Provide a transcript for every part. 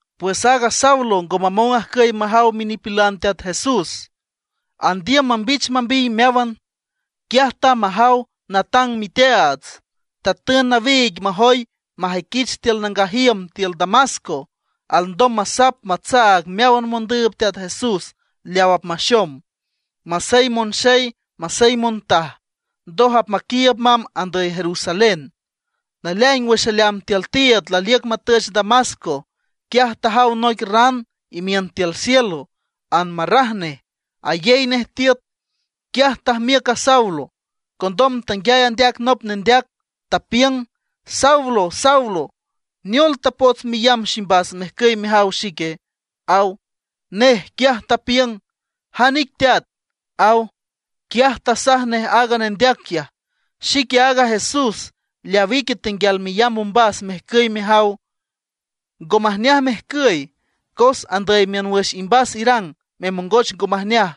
Pues aaga Saulo ngo mamong ajcüy majaw minipilan Teat Jesús, andiüm mambich mambiy meáwan. Quiaj tamb majaw natang miteaats. Tatün nawiig majoy majüiquich tiül nangaj iüm tiül Damasco, alndom masap matsaag meáwan mondüüb Teat Jesús leaw apmaxom, masey monxey masey montaj. Ndoj apmaquiiüb mamb andüy Jerusalén. Naleaing wüx aleamb tiül tiiüd laliüc matüch Damasco, quiaj tajaw noic ran imiün cielo, anmarraj nej, ayey nej tiüt. Quiaj tajmiüc a Saulo. Condom tanguiay andeac nop nendeac, tapiüng: ―Saulo, Saulo ¿neol tapots meyamb ximbas mejcüy mejaw xique? ―aw. Nej, quiaj tapiüng: ―¿Jan ic teat? ―aw. Quiaj tasaj nej aaga nendeac quiaj: ―Xique aaga Jesús, leaw ique tenguial meyamb ombas mejcüy mejaw. Ngo majneaj mejcüy, cos andüy miün wüx imbas irang memongoch ngo majneaj,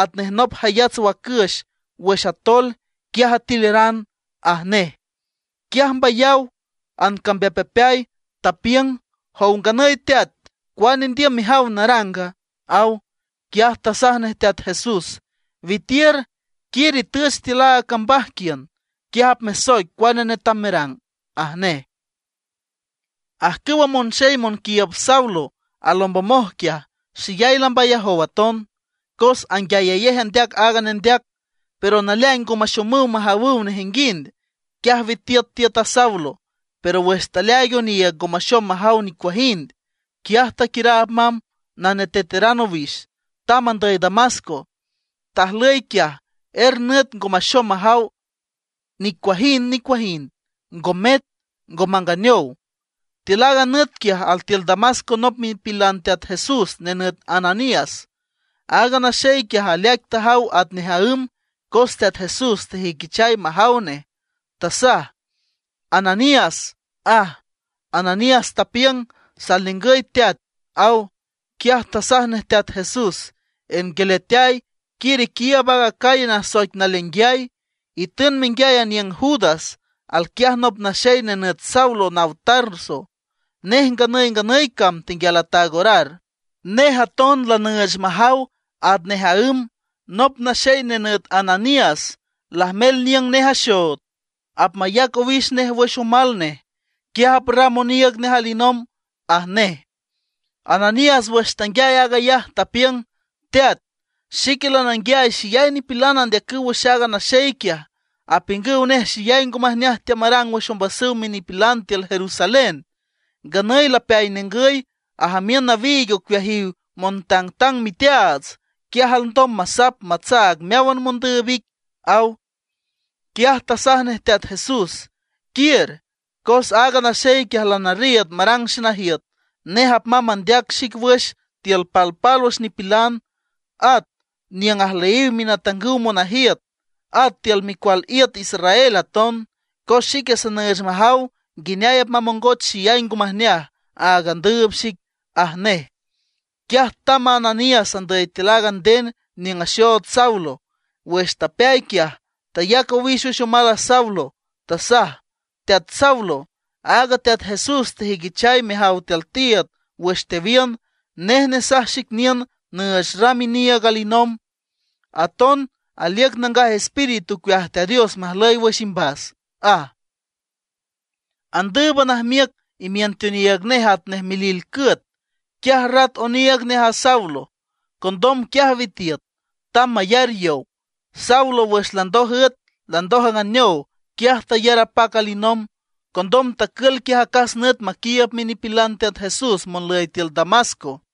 atnej nop jayats wacüx wüx atoel, quiaj atileran ―aj nej. Quiaj mbayaw, ancambeapmbeapeay. Tapiüng: ―Jow nganüy Teat ¿cuane indiüm mejaw naranga? ―aw. Quiaj tasaj nej Teat Jesús: ―Witiür, quiür itüch tiül aaga cambaj quiün. Quiaj apmesoic cuane netam merang ―aj nej. Ajcüwa monxey monquiiüb Saulo alombomoj quiaj, xeyay lambayajow aton. Cos anguiayayej andeac aaga nendeac, pero naleaing ngo maxomüw majawüw nejinguind. Quiaj witiüt tiüt a Saulo; pero wüx taleaaig oniiüg ngo maxom majaw nicuajind. Quiaj taquiüraab mamb, naneteteran owix, tamb andüy Damasco. Tajlüy quiaj er nüt ngo maxom majaw nicuajind nicuajind, ngo met, ngo manganeow. Tiül aaga nüt quiaj altiül Damasco nop minipilan Teat Jesús nenüt Ananías. Aaga naxey quiaj aleaic tajaw atnej aǘm, cos Teat Jesús tejüiquichay majaw nej. Tasaj: ―¡Ananías! ―aj. Ananías tapiüng: ―Sal ningüy Teat ―aw. Quiaj tasaj nej Teat Jesús: ―Ernguialeateay, quiür iquiiüb aaga calle nasoic Naleainguiay, itün menguiay aniüng Judas. Alquiaj nop naxey nenüt Saulo naw Tarso, nej nganüy nganüy cam tenguial ataag orar. Nej aton lanüüch majaw atnej aǘm, nop naxey nenüt Ananías lajmel niüng nej axood, apmayac owix nej wüx omal nej, quiaj aprram oniiüg nej alinomb ―aj nej. Ananías wüx tanguiay aag ayaj, tapiüng: ―Teat, xique lananguiay xeyay nipilan andeacüw wüx aaga naxey quiaj, apiüngüw nej xeyay ngo majneaj teamarang wüx ombasüw minipilan tiül Jerusalén. Nganüy lapeay ningüy, ajamiün nawiig ocueajiw montangtang miteaats, quiaj alndom masap matsaag meáwan mondüüb ic ―aw. Quiaj tasaj nej Teat Jesús: ―Quiür, cos aaga naxey quiaj lanarriiüd marang xenajiüt. Nej apmamb mandeac xic wüx tiül palpálwüx nipilan, at niüng ajlüyiw minatangüw monajiüt, at tiül micual iüt Israel aton. Cos xique sanüüch majaw nguineay apmamongoch xeyay ngo majneaj áag andüüb xic ―aj nej. Quiaj tamb a Ananías andüy tiül aaga nden niüng axood Saulo. Wüx tapeay quiaj, tayac owix wüx omal a Saulo. Tasaj: ―Teat Saulo, aaga Teat Jesús tejüiquichay mejaw tiül tiiüd wüx tewiün, nej nesaj xic niün nüüch ram iniiüg alinomb. Aton aliüc Nangaj Espíritu ocueaj Teat Dios majlüy wüx imbas ―aj. Andǘüban ajmiüc imiün teoniiüg nej atnej milil cüet. Quiaj rat oniiüg nej a Saulo. Condom quiaj witiüt, tamb mayar yow. Saulo wüx landoj üet, landoj anganeow, quiaj tayar apac alinomb. Condom tacül quiaj acas nüt maquiiüb minipilan Teat Jesús monlüy tiül Damasco.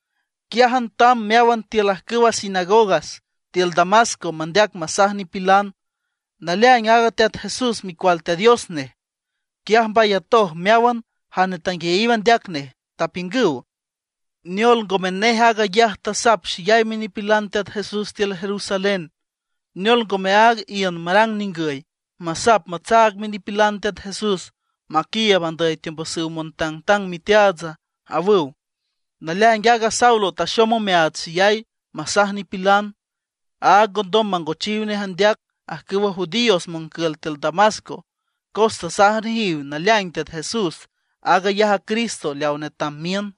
Quiájan tamb meáwan tiül ajcüwa sinagogas tiül Damasco mandeac masaj nipilan, naleaing aaga Teat Jesús Micual Teat Dios nej. Quiaj mbayatoj meáwan jane tanguiayiw andeac nej, tapiüngüw: ―¿Neol, ngome nej aag ayaj tasap xeyay minipilan Teat Jesús tiül Jerusalén? ¿Neol ngome áag iün marang ningüy, masap matsaag minipilan Teat Jesús maquiiüb andüy teombasüw montangtang miteaatsa? ―awüw. Naleaing aaga Saulo taxom omeaats xeyay masaj nipilan, áag ngondom mangochiw nej andeac ajcüwa judíos moncül tiül Damasco, cos tasaj nejiw naleaing Teat Jesús aag ayaj a Cristo leaw netam miün.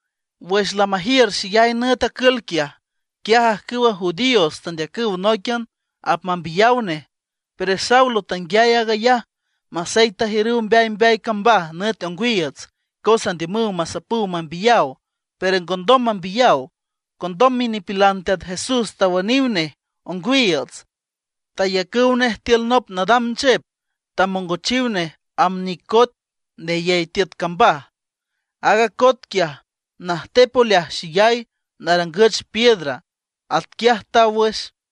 Wüx lamajiür xeyay nüt acül quiaj, quiaj ajcüwa judíos tandeacüw nóiquian apmambiyaw nej. Pero Saulo tanguiay aag ayaj. Masey tajiürüw mbeay mbeay cambaj nüt ongwiiüts cos andiümüw masapüw mambiyaw, pero ngondom mambiyaw. Condom minipilan Teat Jesús tawüniw nej ongwiiüts; tayacüw nej tiül nop nadam nchep, tamongochiw nej amb nic coet neyey tiüt cambaj. Aaga coet quiaj, najtep oleaj xeyay, narangüch piedra. Atquiaj taw wüx.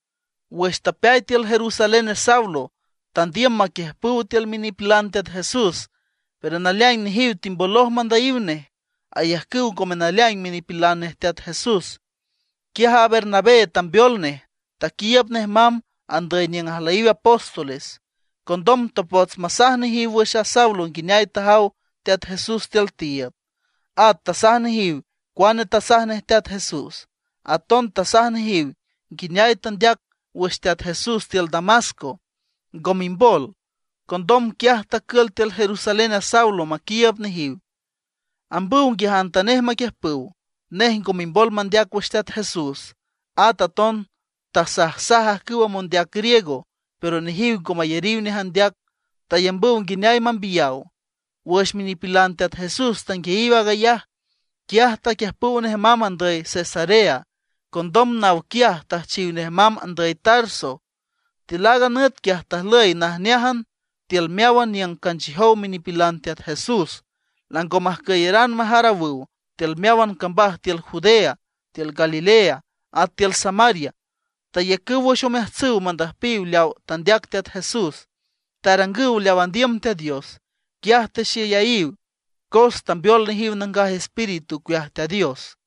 Wüx tapeay tiül Jerusalén a Saulo, tandiüm maquiüjpüw tiül minipilan Teat Jesús; pero naleaing nejiw timboloj mandüyiw nej; ayajcüw ngome naleaing minipilan nej Teat Jesús. Quiaj a Bernabé tambeol nej, taquiiüb nej mamb andüy niüng ajlüyiw apóstoles. Condom tapots masaj nejiw wüx a Saulo nguineay tajaw Teat Jesús tiül tiiüd. At tasaj nejiw cuane tasaj nej Teat Jesús, aton tasaj nejiw nguineay tandeac wüx Teat Jesús tiül Damasco, ngo mimbol. Condom quiaj tacül tiül Jerusalén a Saulo maquiiüb nejiw, ambüw nguiajantanej maquiüjpüw. Nej ngo mimbol mandeac wüx Teat Jesús. At aton tasajsaj ajcüwa mondeac griego; pero nejiw ngo mayariw nej andeac; tayambüw nguineay mambiyaw. Wüx minipilan Teat Jesús tanguiayiw aag ayaj, quiaj taquiüjpüw nej mamb andüy Cesarea. Condom naw quiaj tüjchiw nej mamb andüy Tarso. Tiül aaga nüt quiaj tajlüy najneájan tiül meáwan niüng canchiüjow minipilan Teat Jesús. Lango majcüyaran majarawüw tiül meáwan cambaj tiül Judea, tiül Galilea, at tiül Samaria. Tayacüw wüx omeajtsüw mandüjpiw leawa tandeac Teat Jesús, tarangüw leaw andiüm Teat Dios. Quiaj texeyayiw, cos tambeol nejiw Nangaj Espíritu ocueaj Teat Dios.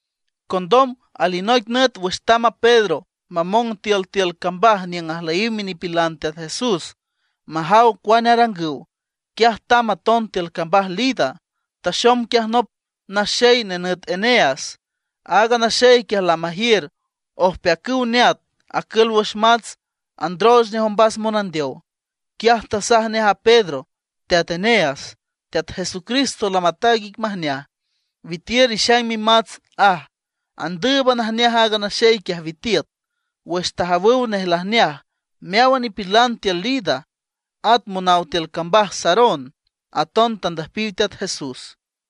Condom alinoic nüt wüx tamb a Pedro mamong tiül tiül cambaj niüng ajlüyiw minipilan Teat Jesús majaw cuane arangüw, quiaj tamb aton tiül cambaj Lida. Taxom quiaj nop naxey nenüt Eneas. Aaga naxey quiaj lamajiür ojpeacüw neat acül wüx mats, androoch nej ombas monandeow. Quiaj tasaj nej a Pedro: ―Teat Eneas, Teat Jesucristo lamataag ic majneaj, witiür, ixaing mimats ―aj. Andǘüban ajneaj aaga naxey quiaj, witiüt. Wüx tajawüw nej lajneaj, meáwan nipilan tiül Lida, at monaw tiül cambaj Sarón aton tandüjpiw Teat Jesús.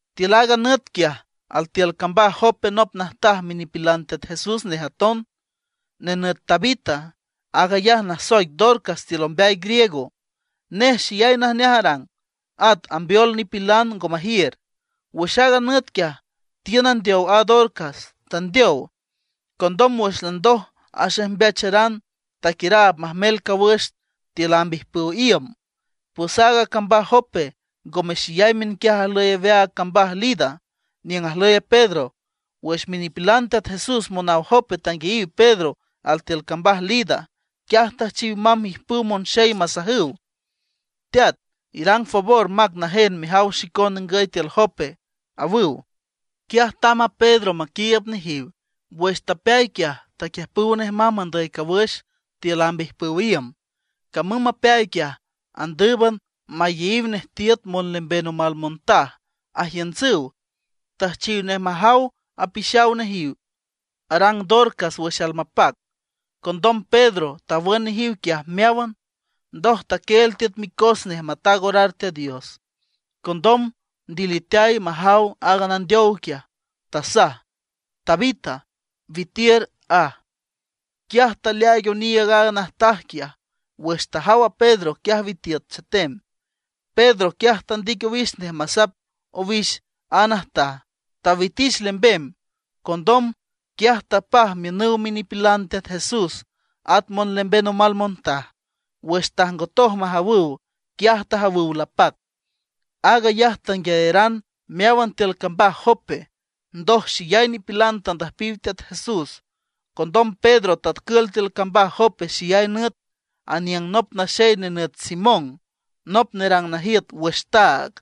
Tiül aaga nüt quiaj, altiül cambaj Jope nop najtaj minipilan Teat Jesús nej aton, nenüt Tabita. Aag ayaj nasoic Dorcas tiül ombeay griego. Nej xeyay najneaj arang, at ambeol nipilan ngo majiür. Wüx aaga nüt quiaj, tiün andeow a Dorcas, tandeow. Condom wüx landoj axejmbeacharan, taquiüraab majmel cawüx tiül amb ijpüw iüm. Pues aaga cambaj Jope ngome xeyay miünquiaj ajlüy aweaag cambaj Lida, niüng ajlüy Pedro. Wüx minipilan Teat Jesús monaw Jope tanguiayiw Pedro altiül cambaj Lida, quiaj tüjchiw mamb ijpüw monxey masajüw: ―Teat, irang favor, mac najen mejaw xicon ningüy tiül Jope ―awüw. Quiaj tamb a Pedro maquiiüb nejiw. Wüx tapeay quiaj, taquiüjpüw nej mamb andüy cawüx tiül amb ijpüw iüm. Camüm mapeay quiaj, andǘüban mayeyiw nej tiüt monlemben omal montaj, ajiüntsüw. Tüjchiw nej majaw apixaw nejiw arang Dorcas wüx almapac. Condom Pedro tawün nejiw quiaj meáwan, ndoj taquieel tiüt micos nej mataag orar Teat Dios. Condom ndiliteay majaw aaga nandeow quiaj, tasaj: ―Tabita, witiür ―aj. Quiaj taleaaig oniiüg aaga najtaj quiaj, wüx tajaw a Pedro quiaj witiüt chetem. Pedro, quiaj tandic owix nej masap owix a najtaj, tawitich lembem. Condom, quiaj tapaj miünüw minipilan Teat Jesús at monlemben omal montaj. Wüx tajngotoj majawüw, quiaj tajawüw lapac. Aag ayaj tanguiayaran meáwan tiül cambaj Jope, ndoj xeyay nipilan tandüjpiw Teat Jesús. Condom Pedro tacül tiül cambaj Jope xeyay nüt, aniüng nop naxey nenüt Simón, nop nerang najiüt wüx taag.